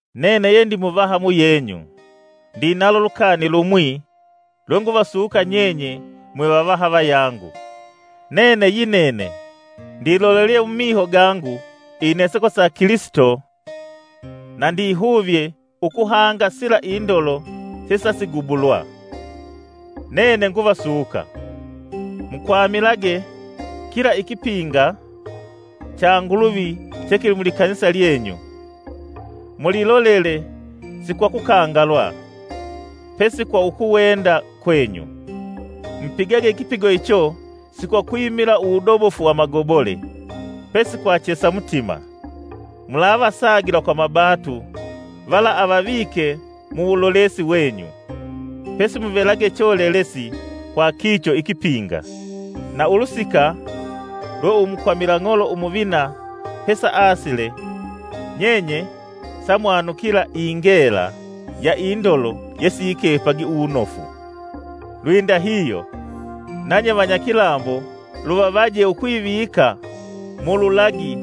Nene yendi muvaha ndinalo lukani lumwi lwenguvasuka nyenye mwe vavaha vayangu. Nene yinene ndilolelye mumiho gangu ineseko sa Kilisito na ndikuvye ukuhanga sila indolo sesasigubulwa. Nene nguvasuka mukwamilage kila ikipinga cha Nguluvi che kili mu likanisa lyangu, mulilolele si kwa kukangalwa, pesi kwa ukuwenda kwenyu. Mupigage ikipigo icho si kwakwimila uwudobofu wa amagobole, pesi kwa chesa mutima. Mulavasagila kwa mabatu vala avavike muwulolesi wenyu, pesi muvelage cholelesi kwa lilyo lipinga. Na ulusika lwe Umukwamila ing'olo umuvina pesa asile, nyenye samwanukila ingela ya indolo yesiyikepagi uwunofu. Lwindahihyo nanye vanyakilambo luvavaje ukwivika mululagi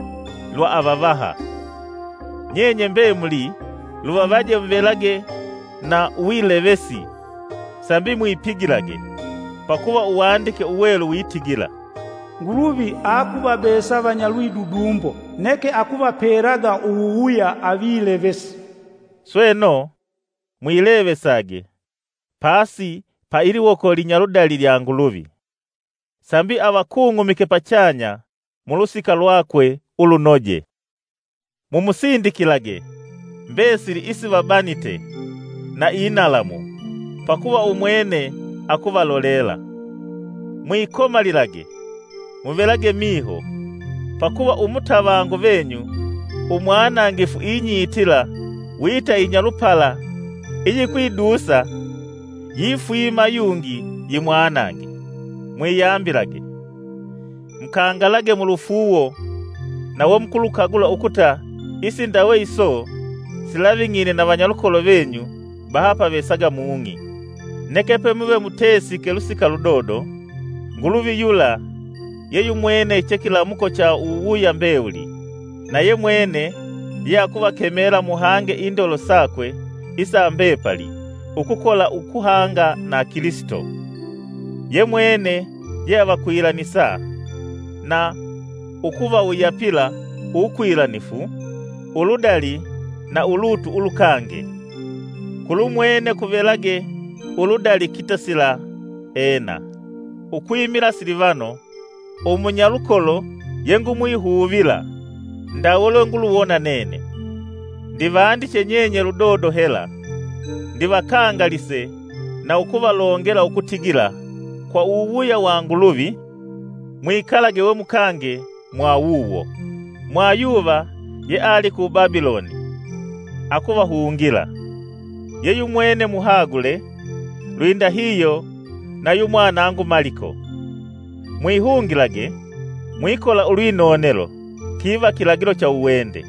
lwa avavaha. Nyenye mbemuli luvavaje muvelage na uwilevesi sambi mwipigilage; pakuva Uwandike Uwelu witigila: “Nguluvi akuvabesa vanyalwidudumbo, neke akuvapelaga uwuwuya avilevesi.” Sweno, mwilevesage pasi pa iliwoko linyaludali lya Nguluvi, sambi avakung'umike pachanya mulusika lwakwe ulunoje. Mumusindikilage mbesili isivabanite na inalamu, pakuva umwene akuvalolela. Mwikomalilage, muvelage miho! Pakuva umutavangu venyu, umwanangifu inyitila wita inyalupala iyikwidusa yifwima yungi yimwanange. Mwiyambilage, mukangalage mulufuuwo na wemukulukagula ukuta isindawe iso silaving'ine na vanyalukolo venyu bahapavesaga mung'i. Neke pemuve mutesiike lusika ludodo, Nguluvi yula ye yumwene che kilamuko cha uwuwuya mbewuli na yemwene yeakuvakemela muhange indolo sakwe isa mbepali ukukola ukuhanga na Kilisito. Yemwene yeavakwilanisa na ukuvawuyapila uwukwilanifu, uludali na ulutu ulukange. Kulumwene kuvelage uludali kitasila! Ena. Ukwimila Silivano, umunyalukolo ye ngumwihuvila ndawe lwe nguluwona nene, ndivandiche nyenye ludodo hela ndivakangalise na ukuvalongela ukutigila kwa uwuwuya wa Nguluvi, mwikalage we mukange mwa wuwo. Mwayuva yeali ku Babiloni akuvahungila, ye yumwene muhagule, lwindahihyo na yu mwanangu Maliko. Mwihungilage mwikola ulwinonelo kiva kilagilo cha uwende.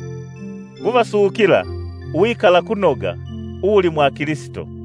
Nguvasukila uwikalakunoga uwuli mwa Kilisito.